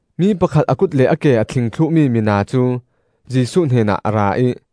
Mi pakhat a kut le a ke a thling thluhmi mina cu Jesuh hnenah a ra ih,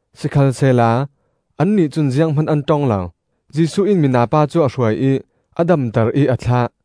Sikhalsehla annih cun zianghman an ṭong lo. Jesuh in mina pa cu a hruai ih a damter ih a thlah.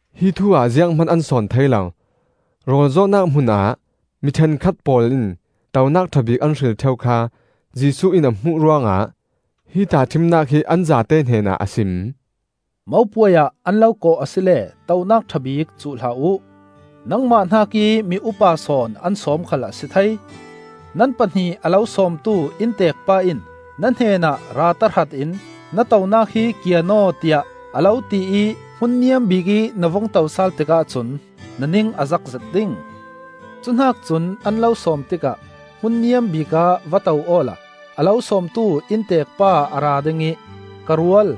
Hi thu-ah zianghman an sawn thei lo. Rawl zawhnak hmunah mi ṭhenkhat pawl in tonak ṭha bik an hril ṭheu kha Jesuh in a hmuh ruangah hi tahṭhimnak hi an zate hnenah a sim: “Mopuai ah an lo kawh asile tonak ṭha bik cuh hlah uh. Nangmah hnakih mi upa sawn an sawm khal a si thei; nan pahnih a lo sawmtu innteek pa in na hnenah ra tahratin, ‘Na tonak hi kian aw,’ tiah a lo tiih hmun niam bikih na vung to sal tikah cun na ning a zakzet ding. Cuhnak cun an lo sawm tikah hmun niam bikah va to awla a lo sawmtu innteek pa a ra ding ih, ‘Ka rual,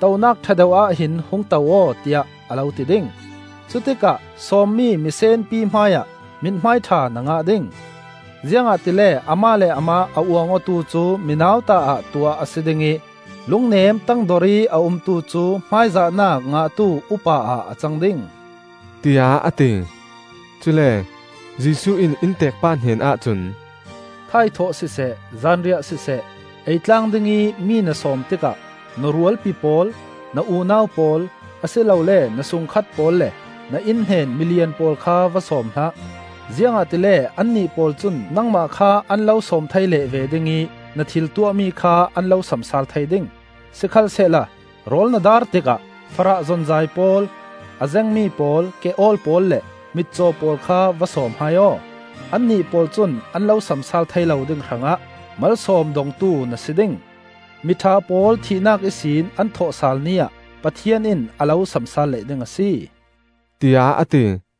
tonak ṭha deuhah hin hung to aw,’ tiah a lo ti ding. Cutikah sawmmi misenpi hmaiah mithmaiṭha na ngah ding. Ziangahtile amah le amah a uang awtu cu mi nauta ah tuah a si ding ih, lungnem tangdor ih a umtu cu hmaizahnak ngahtu upa-ah a cang ding,” tiah a ti. Cule Jesuh in innteek pa hnenah cun, “Thaithawh siseh zanriah siseh, eitlang dingih mi na sawm tikah na rualpi pawl, na unau pawl, a si lole na sungkhat pawl le na innhnen milian pawl kha va sawm hlah; ziangahtile annih pawl cun nangmah kha an lo sawm thei leh ve ding ih na thil tuahmi kha an lo samsaal thei ding. Sikhalsehla rawl na daar tikah farah zonzai pawl, a zengmi pawl, ke-awl pawl le mitcaw pawl kha va sawm hai aw; annih pawl cun an lo samsaal thei lo ding hrangah malsawm dongtu na si ding. Miṭha pawl thihnak ihsin an thawhsal ni ah Pathian in a lo samsaal leh ding a si,” tiah a ti.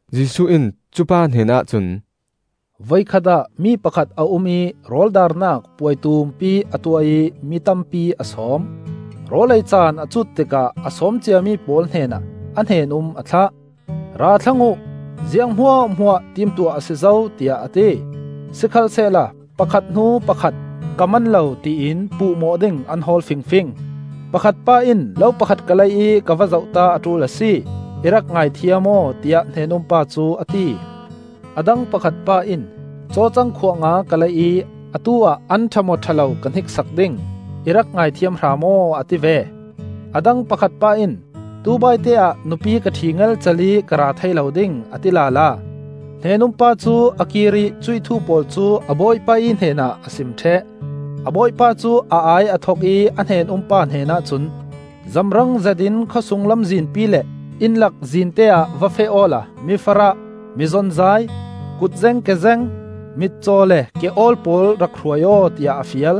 Jesuh in cupa hnenah cun, “Voikhat ah mi pakhat a um ih rawl daarnak puai tumpi a tuah ih mi tampi a sawm. Rawl ei caan a cut tikah a sawm ciami pawl hnenah a hnen-um a thlah. ‘Ra thlang uh, ziang hmuahhmuah timtuah a si zo,’ tiah a ti. Sikhalsehla pakhat hnu pakhat ‘Ka man lo,’ tiin puhmawh ding an hawl fingfing. Pakhat pa in ‘Lo pakhat ka lei ih ka va zohta a ṭul a si. I rak ngaithiam aw,’ tiah hnen-um pa cu a ti. A dang pakhat pa in ‘Cawcang khuah nga ka lei ih atu-ah an ṭha maw ṭha lo ka hniksak ding. I rak ngaithiam hram aw,’ a ti ve. A dang pakhat pa in ‘Tubaite ah nupi ka ṭhi ngelcel ih ka ra thei lo ding,’ a ti lala. Hnen-um pa cu a kir ih cuih thu pawl cu a bawipa ih hnenah a sim ṭheh. A bawipa cu a ai a thok ih a hnen-um pa hnenah cun, ‘Zamrang zetin khawsung lamzinpi le innlak zinte ah va feh awla mi farah, mi zonzai, kutzeng kezeng, mitcaw le ke-awl pawl rak hruai aw,’ tiah a fial.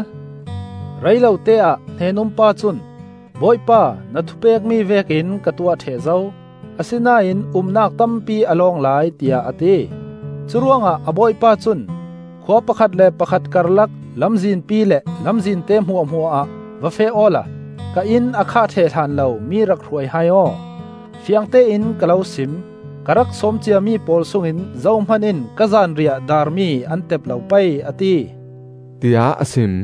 Rei lote-ah hnen-um pa cun ‘Bawipa, na thu pekmi vekin ka tuah ṭheh zo; asinain umnak tampi a lawng lai,’ tiah a ti. Curuangah a bawipa cun, ‘Khua pakhat le pakhat karlak lamzinpi le lamzinte hmuahhmuah ah va feh awla ka inn a khah ṭheh hlan lo mi rak hruai hai aw. Fiangtein ka lo sim: Ka rak sawm ciami pawl sungin zohman in ka zanriah daarmi an tep lo pei,’ a ti,” tiah a sim.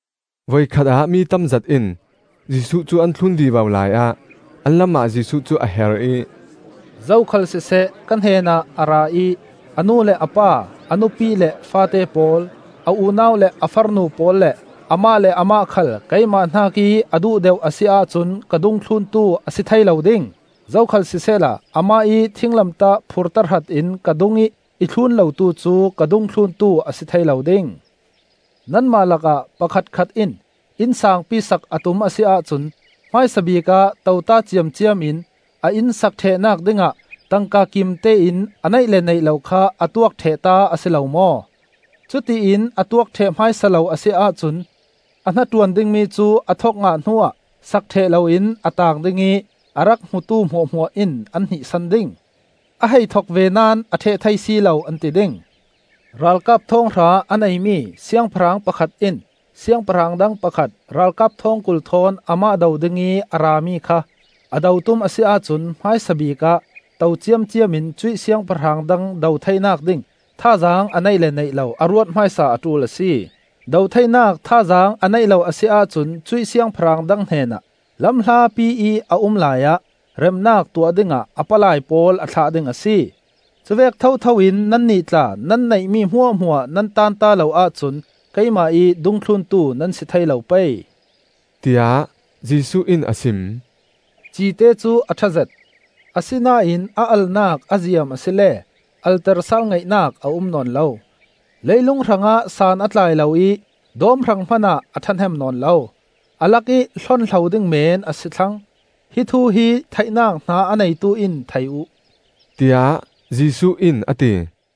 Voikhat ah mi tamzet in Jesuh cu an thlun vivo laiah an lamah Jesuh cu a her ih, “Zokhal siseh ka hnenah a ra ih a nu le pa, a nupi le faate pawl, a unau le a farnu pawl le amah le amah khal keimah hnakih a duh deuh a si ahcun ka dungthluntu a si thei lo ding. Zokhal sisehla amah ih thinglamtah phur tahratin ka dungih i thlun lotu cu ka dungthluntu a si thei lo ding. “Nanmah lakah pakhatkhat in inn saangpi sak a tum a si ahcun hmaisabik ah tote ciamciam in a inn sak ṭhehnak dingah tangka kimtein a neih le neih lo kha a tuak ṭhehta a si lo maw? Cutiin a tuak ṭheh hmaisa lo a si ahcun a hnaṭuan dingmi cu a thok ngah hnu-ah sak ṭheh loin a taang ding ih a rak hmutu hmuahhmuah in an hnihsan ding. ‘A hei thok ve naón a ṭheh thei si lo!’ an ti ding. “Ralkap thawnghra a neimi siangpahrang pakhat in siangpahrang dang pakhat ralkap thawngkul thawn amah do dingih a rami kha, a do tum a si ahcun hmaisabik ah to ciamciamin cuih siangpahrang dang do theinak ding thazaang a neih le neih lo a ruat hmaisa a ṭul a si. Do theinak thazaang a neih lo a si ahcun cuih siangpahrang dang hnenah, lam hlapi ih a um laiah, remnak tuah dingah a palai pawl a thlah ding a si. Cuvek thotho in nannih tla nan neihmi hmuahhmuah nan tanta lo ahcun keimah ih dungthluntu nan si thei lo pei,” tiah Jesuh in a sim. “Cite cu a ṭhazet, asinain a alnak a ziam asile alter sal ngaihnak a um nawn lo. Leilung hrangah san a tlai lo ih dawm hrang hmanah a ṭhahnem nawn lo. A lakih hlonhlo ding men a si thlang. Hi thu hi theihnak hna a neitu in thei uh,” tiah Jesuh in a ti.